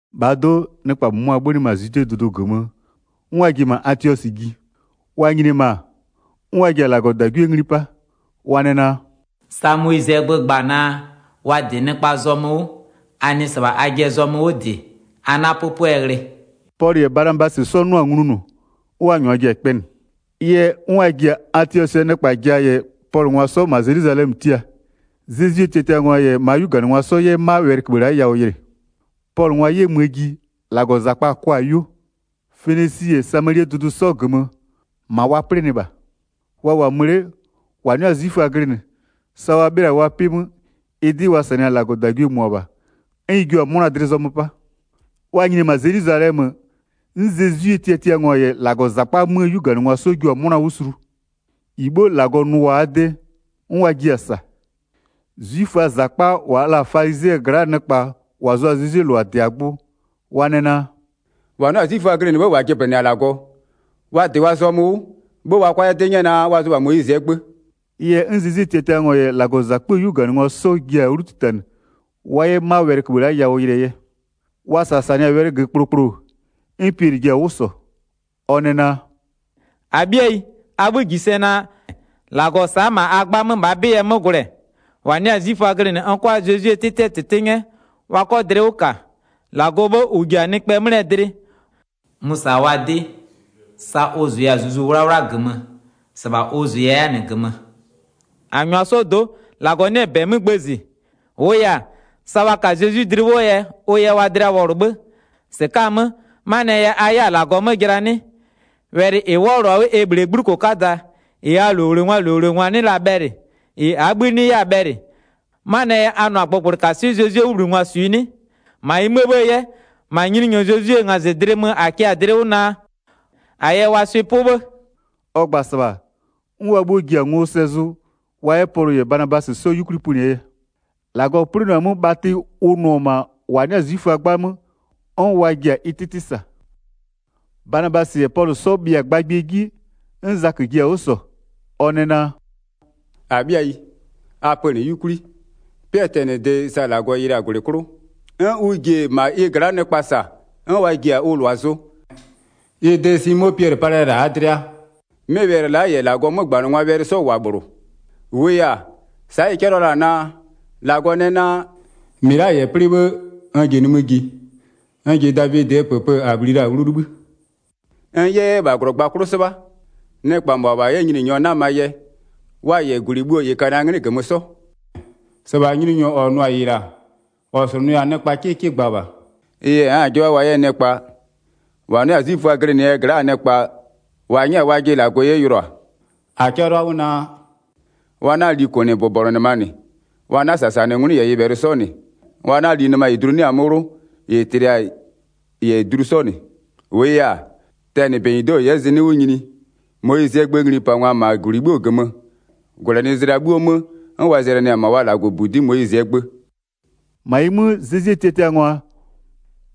1-Bhaa do'o, nɩkpa -mʋmʋa 'bhönɩ -ma Zwidee dʋdʋ -gömö, 'n wa ji-e ma Atiɔsɩ ji. Wa nyini-e -ma, 'n wa ji-a -Lagɔdagwie ngli 'pa, wa nɛ naa: “Sa Moyizɩɛ gbö gba-a naa, wa -dɩ nɩkpaa zɔmö 'wʋ, a nɩ -sɩbha ajɩɛ zɔmö 'wʋ -dɩ a 'na 'pʋpʋɛ ghlɩ.” Pɔlʋ -yɛ Banabasɩ 'sɔ 'nʋa-a nglunʋ, 'n wa -nyʋa ji-a kpɛnɩ. Ɩ yɛ, 'n wa ji-a Atiɔsɩɛ nɩkpa ja -yɛ Pɔlʋngwa 'sɔ -ma Zelwizalɛmö tia, Zezwie tiatiangwa -yɛ -maa 'yuganɩngwa 'sɔ 'yɛ 'ma wɛlɩköbhë la'a yawʋ yɩlɩ. Pɔlʋngwa 'yɛ möö ji, -Lagɔzakpa-a kʋa-a 'yuo. Fenisi -yɛ Samalie dʋdʋ 'sɔ -gömö, -ma wa 'plɩnɩ -bha. Wa -wʋ-a mö 'le, -wa 'nɩ-a 'zwiföa glɩnɩ, sa wa 'bhɩla-a wa 'pɩ 'mö, ɩ 'dɩ wa -sanɩ-a -Lagɔdagwie -mʋabha, 'n ɩ jua-a 'mʋna dlɩ zɔmö 'pa. Wa nyini-e -ma Zelwizalɛmö, 'n Zezwie tiatiangwa -yɛ -Lagɔzakpa 'möö 'yuganɩngwa 'sɔ jua-a 'mʋna 'wʋ sulu. -Ɩ 'bhuo -Lagɔ nʋ-a wa de, 'n wa jiɩ-a -sa. 'Zwiföaa -zakpa wa la-a falizɩɛ gla'aa nɩkpa -wa zʋ-a Zezwie -lʋa -dɩ-a gbʋ, wa nɛ naa: “-Wa 'nɩ-a 'zwiföa glɩnɩ 'bhë -wa jɩblɩnɩ-a -Lagɔ, wa -dɩ wa zɔmö 'wʋ 'bhë wa 'kʋa 'yɛ 'dɩ 'nyɛ naa, wa zʋ -bha Moyizɩɛ gbö.” Ɩ yɛ 'n Zezwie tiatiangwa -yɛ -Lagɔzakpöö 'yuganɩngwa 'sɔ ji-a 'wlu 'titanɩ, wa 'yɛ 'ma wɛlɩköbhë la'a yawʋ yɩlɩɛ yɛ. Wa -sasanɩ-a wɛlɩ -gömö kplokplo, 'n Piɛlɩ ji-a 'wʋ -sɔ. Ɔ nɛ naa: “-Abhɩayi, a 'bhï -ji sɛ naa, -Lagɔ sa'a-a -ma a 'gbamö -bhaa 'bɩ yɛ 'mö gwlɛ, -wa 'nɩ-a 'zwiföa glɩnɩ n 'kʋa Zezwie 'tɩtɩɛ -tɩtɩ 'nyɛ, wa 'kɔ dlɩ 'wʋ -ka. 8-Lagɔɔ 'bhë -ʋ -ji-a nɩkpɛɛ 'mlɩɛ dlɩ, mʋ-ʋ -sa-a wa 'dɩ sa ʋ -zʋya-a Zuzu 'Wlawla -gömö, -sɩbha ʋ zʋʋa 'yɛ-a -nɩ -gömö. 9-A -nyʋa 'sɔɔ do'o, -Lagɔ 'nɩ-ɛ -bɛ 'mö gbëzɩ. -Wʋʋ yɛ-a, sa wa ka-a Zezwi dlɩ 'wʋɔ yɛ ʋ yɛ wa dlɩa wɔlʋ 'bhë. 10-Sɩka'a-a 'mö, 'manɩɛ yɛ a 'yɛ-a -Lagɔ 'mö jɩla 'nɩ? Wɛlɩ -ɩ 'wɔlʋ-a 'wʋ e -bhlee 'gbluko 'kada, -ɩ -aa -lowlengwaa -lowlengwa 'nɩ la-a bhɛlɩ, -ɩ -aa 'bhï 'nɩ 'yɛ-a bhɛlɩ, 'manɩɛ yɛ a nʋ-a gbʋgblɩkaswɩ'ɩ Zezwie 'wʋbhlinɩngwa -swiɩ 'nɩ? 11-Ma ɩ 'möö 'bhë 'yɛ, -ma Nyininyɔ Zezwie ngazɩdlɩ mö -a kɩ-a dlɩ 'wʋ naa, a yɛ wa swɩ'ɩ 'pʋ 'bhë.” 12Ɔ gba-a -sɩbha, 'n wa 'bhuo ji-a ngo sɛ zʋ wa 'yɛ Pɔlʋ -yɛ Banabasɩ 'sɔ 'yukwli pönɩɛ yɛ. -Lagɔ 'plɩnʋa-a 'mö bhatɩ ʋ nʋ-ɔ -ma -wa 'nɩ-a 'zwiföaa 'gbamö, 'n wa ji-a ɩ 'tɩtɩ -sa. Zaköö 'mösanɩwɛlɩ 13Banabasɩ -yɛ Pɔlʋ 'sɔ bhɩa-a gbagbɩɛ 'ji, 'n Zakö ji-a 'wʋ -sɔ. Ɔ nɛ naa: “-Abhɩayi, a -pönɩ'ɩ 'yukwli. 14'Pɩɛ tɛnɩde sa -Lagɔ yɩlɩ-a -gwlɩ 'klʋ, 'n ʋ ji-e -ma ɩ gla'a nɩkpa -sa 'n wa ji-a ʋ -lʋa zʋ, ɩ de Simo Piɛlɩ palɩ-ɛ -la -aa dlɩa. 15'Mɩ wɛlɩ la'a -yɛ -Lagɔɔ 'mögbanɩngwaa wɛlɩ 'sɔ -wʋ-a -bhlʋ. -Wʋʋ yɛ-a, sa'a ɩ 'cɛlɩɔ la-a naa: -Lagɔ nɛ naa: 16-Mɩ la'a -yɛ 'plɩ 'bhë, n ji nimï ji, n ji Davidɩɛ -pëpë -a bhli la-a 'wlu libhï, 'n n 'yɛ-ɛ -bha -glɔgba 'klʋ 'sɩbha, 17nɩkpa -mʋabha 'yɛ Nyininyɔ 'namaa yɛ, wa -yɛ -gwlɩ bhuo -ɩ ka-a na 'nglɩ -gömö 'sɔ. 18-Sɩbha Nyininyɔ -ɔ nʋ-a -ɩ -la, -ɔ slʋnʋɩ-a nɩkpa 'kɩkɩ gba -bha. 19Ɩ yɛ n'n-a 'jɩbha wa 'yɛ nɩkpa -wa 'nɩ-a 'zwiföa glɩnɩɛ gla'aa nɩkpa -wa 'nyɛ-a wajɩ -Lagɔ 'ye yʋlʋa. 20-A 'cɛlʋa 'wʋ naa: Wa 'na-a li -kʋnɩbʋbɔnʋnɩma -nɩ, wa 'na-a -sasanɩ 'ngwlɩ -yɛ nyɩbhɛlɩ 'sɔ -nɩ, wa 'na-a li nɩma -ɩ dlu 'nɩ-a 'mö 'wlʋ -ɩ tlɩ-a -yɛ dlu 'sɔ -nɩ. 21-Wʋʋ yɛ-a, tɛnɩ -benyido'o -n 'yɛ -zinɩ'ɩ 'wʋ nyini, Moyizɩɛ gböö nglipangwa-a -ma -gwlɩ 'bhuoo -gömö -gwlɛnɩzlɩa 'bhuoo 'mö 'n wa zɛlɩnɩ-ɛ -ma wa -Lagɔbudi'i Moyizɩɛ gbö.” Wa yɛ Zezwie -lʋa -wa 'nɩ-a 'zwiföa glɩnɩ 'bɔgʋ 'wʋ 'pa 22-Ma ɩ 'mö, Zezwie tiatiangwa-a,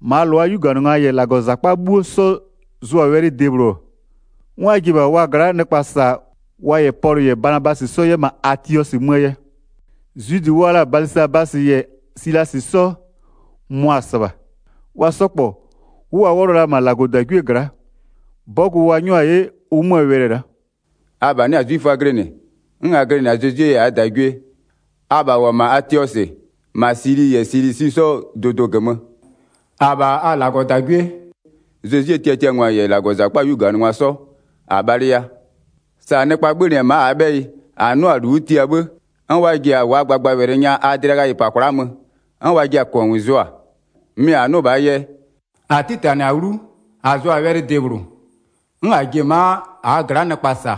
-maa -lʋaa 'yuganɩngwa -yɛ -Lagɔzakpa 'bhuo 'sɔ zʋ-a wɛlɩ debhlʋ, 'n wa ji-e -bha wa gla'aa nɩkpa -sa wa -yɛ Pɔlʋ -yɛ Banabasɩ 'sɔ 'yɛ -ma Atiɔsɩ möö yɛ. Zwidɩ wa la-a Balɩsabasɩ -yɛ Silasɩ 'sɔ, mʋa-a -sɩbha. Wa 'sɔ -kpɔ, 'wʋ wa 'wɔlʋ la-a -ma -Lagɔdagwie gla'a. 23'Bɔgʋ wa 'nyʋa-a 'ye ʋ 'möö wɛlɩ-ɛ la'a: “Abha 'nɩ-a 'zwiföa glɩnɩ, 'n a glɩnɩ-a Zezwie yɛ -aa -dagwie, abha -wʋ-ɔ -ma Atiɔsɩ, -ma Sili -yɛ Silisi 'sɔɔ dʋdʋɩ -gömö, -abha a -Lagɔdagwie, Zezwie tiatiangwa -yɛ -Lagɔzakpaa 'yuganɩngwa 'sɔ, -a bhalɩya. 24Sa nɩkpa 'bhönɩ ma'a -aa 'bhɛyɩ, -a 'nʋa-a -lu 'wʋ tia 'bhë, 'n wa ji-a wa gbagbawɛlɩ nya a dlɩa ghayɩ -pa kwla'a mö 'n wa jɩɩ-a -kɔngʋʋ zʋa, mɩ -a 'nʋ -bhaa yɛ, 25-a 'titanɩ-a 'wlu, -a zʋ-a wɛlɩ debhlʋ, 'n -a ji-e ma'a -aa gla'a nɩkpa -sa,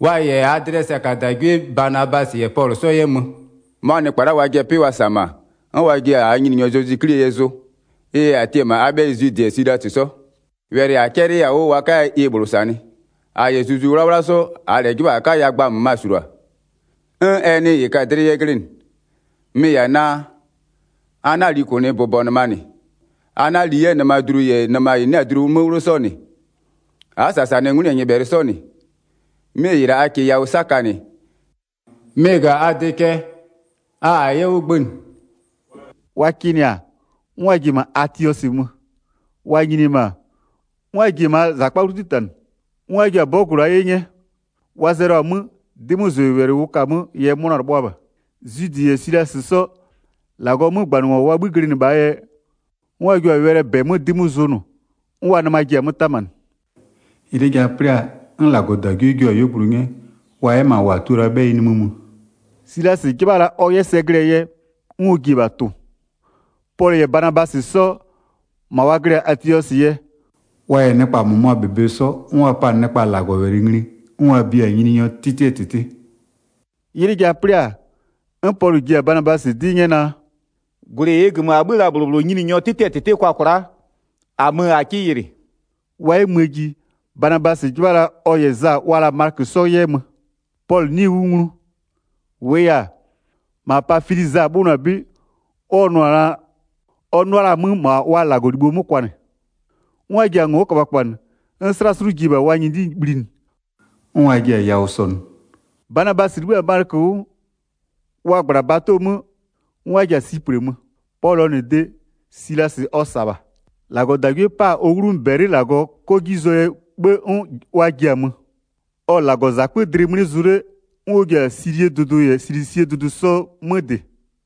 wa -yɛ -aa dlɩɛ sɛkadagwie Banabasɩ -yɛ Pɔlʋ 'sɔ yɛ mö. 26'Mʋa nɩkpa la'a wajɩɛ 'pɩ wa -sa-a -ma, 'n wa jiɛ-a -aa Nyininyɔ Zezwi 'Klie yɛ zʋ. 27Ɩ yɛ -a tia-a -ma a 'bhɛyɩ Zwidɩ -yɛ Silasɩ 'sɔ, wɛlɩ -a 'cɛlɩya-a 'wʋ wa 'kaya ɩ -bhlʋ -sanɩ. 28-A -yɛ Zuzu 'Wlawla 'sɔ, -aa -lɛ 'jɩbha -a 'kaya gba -möma -sulua, 'n ɛ nɩ -ɩ ka-a dlɩ yɛ glɩnɩ. 29Mɩ-ɩ -yɛ-a naa: a 'na-a li -kʋnɩbʋbɔnʋnɩma -nɩ, a 'na-a li 'yɛ nɩmadlu -yɛ nɩma -ɩ 'nɩ-a dlu 'mö 'wlʋ 'sɔ -nɩ, a'a -sasanɩ 'ngwlɩ -yɛ nyɩbhɛlɩ 'sɔ -nɩ. 'Mɩ -ɩ la'a a -kɩɩ yawʋ 'sakanɩ, mɩ-ɩ -ga-a a de cɛ. -A-a 'yɛ 'wʋ gbënɩ.” Tiatiangwa yɛ -ma Atiɔsɩ nyini 30Wa kɩnɩ-a, 'n wa ji-e -ma Atiɔsɩ mö. Wa nyini-e -ma, 'n wa ji-e -maa -zakpa 'wlu 'titanɩ, 'n wa jua-a 'bɔgʋ la'a 'ye 'nyɛ. 31Wa zɛlʋ-a 'mö, 'dɩmözʋwɛlɩ ʋ ka-a 'möö yɛ 'mʋna-a 'lɩbhʋa -bha. 32Zwidɩ -yɛ Silasɩ 'sɔ, -Lagɔɔ 'mögbanɩngwa wa 'bhï glɩnɩ -bhaa yɛ, 'n wa jua-a wɛlɩɛ -bɛ 'mö 'dɩ 'mö zʋnʋ, 'n wa nɩma ji-a 'mö 'tamanɩ. 33'Ylɩ ja 'plɩ-a, 'n -Lagɔdagwie jua-a 'yuogblʋ 'nyɛ, wa 'yɛ -ma -wa tua la-aa 'bhɛyɩ nimï mö. 34Silasɩ 'jɩbha la ɔ 'yɛ sɛ glɩɛ yɛ, 'n ɔ ji-e -bha tʋ-ʋ. 35Pɔlʋ -yɛ Banabasɩ 'sɔ, -ma wa glɩ-a Atiɔsɩ yɛ, wa -yɛ nɩkpa -mʋmʋaa -bebe 'sɔ, 'n wa pa-a nɩkpa -Lagɔwɛlɩ ngli, 'n wa bia-a Nyininyɔɔ 'tɩtɩɛ -tɩtɩ. Pɔlʋ -yɛ Banabasɩ 'sɔ yɛ yawʋ -sɔnʋ 36'Ylɩ ja 'plɩ-a, 'n Pɔlʋ ji-a Banabasɩ 'dɩ 'nyɛ naa: “-Gwlɩ -ɩɩ -gömö -a 'bhö-ö la-a -bhlʋ -bhlʋ Nyininyɔɔ 'tɩtɩɛ -tɩtɩ kwa kwla'a, -a mö -a 'kɩ yɩlɩ.” 37Wa 'yɛ möö ji, Banabasɩ 'jɩbha la ɔ -yɛ Za wa la-a Malɩkö 'sɔ 'yɛ mö. 38Pɔlʋ 'nɩɩ-ɩ 'wʋ nglu. -Wʋʋ yɛ-a, -ma Pafili Za 'bhönʋa-a 'bɩ, ɔ 'nʋa-a la-a 'mö -ma wa -Lagɔlibho 'mö kwanɩ. 39'N wa ji-a ngo'o köbhaköbhanɩ, 'n 'slaslʋ ji-e -bha wa nyɩdɩ bhlinɩ, 'n wa ji-a yawʋ -sɔnʋ. Banabasɩ 'libhï-a Malɩkö 'wʋ, wa -gbla-a bato 'mö 'n wa ji-a Siplɩ mö. 40Pɔlʋɔ -nɩ de, Silasɩ ɔ -sa-a -bha. -Lagɔdagwie 'pa-a ɔ 'wlumö -bɛlɩ -Lagɔ 'kɔ 'ji zʋɔ yɛ 'bhë, 'n wa ji-a mö. 41Ɔ-ɔ -Lagɔzakpö dlɩ mlɩ zʋ 'le, 'n ɔ ji-a Silie dʋdʋ -yɛ Silisie dʋdʋ 'sɔ 'mö -dɩ.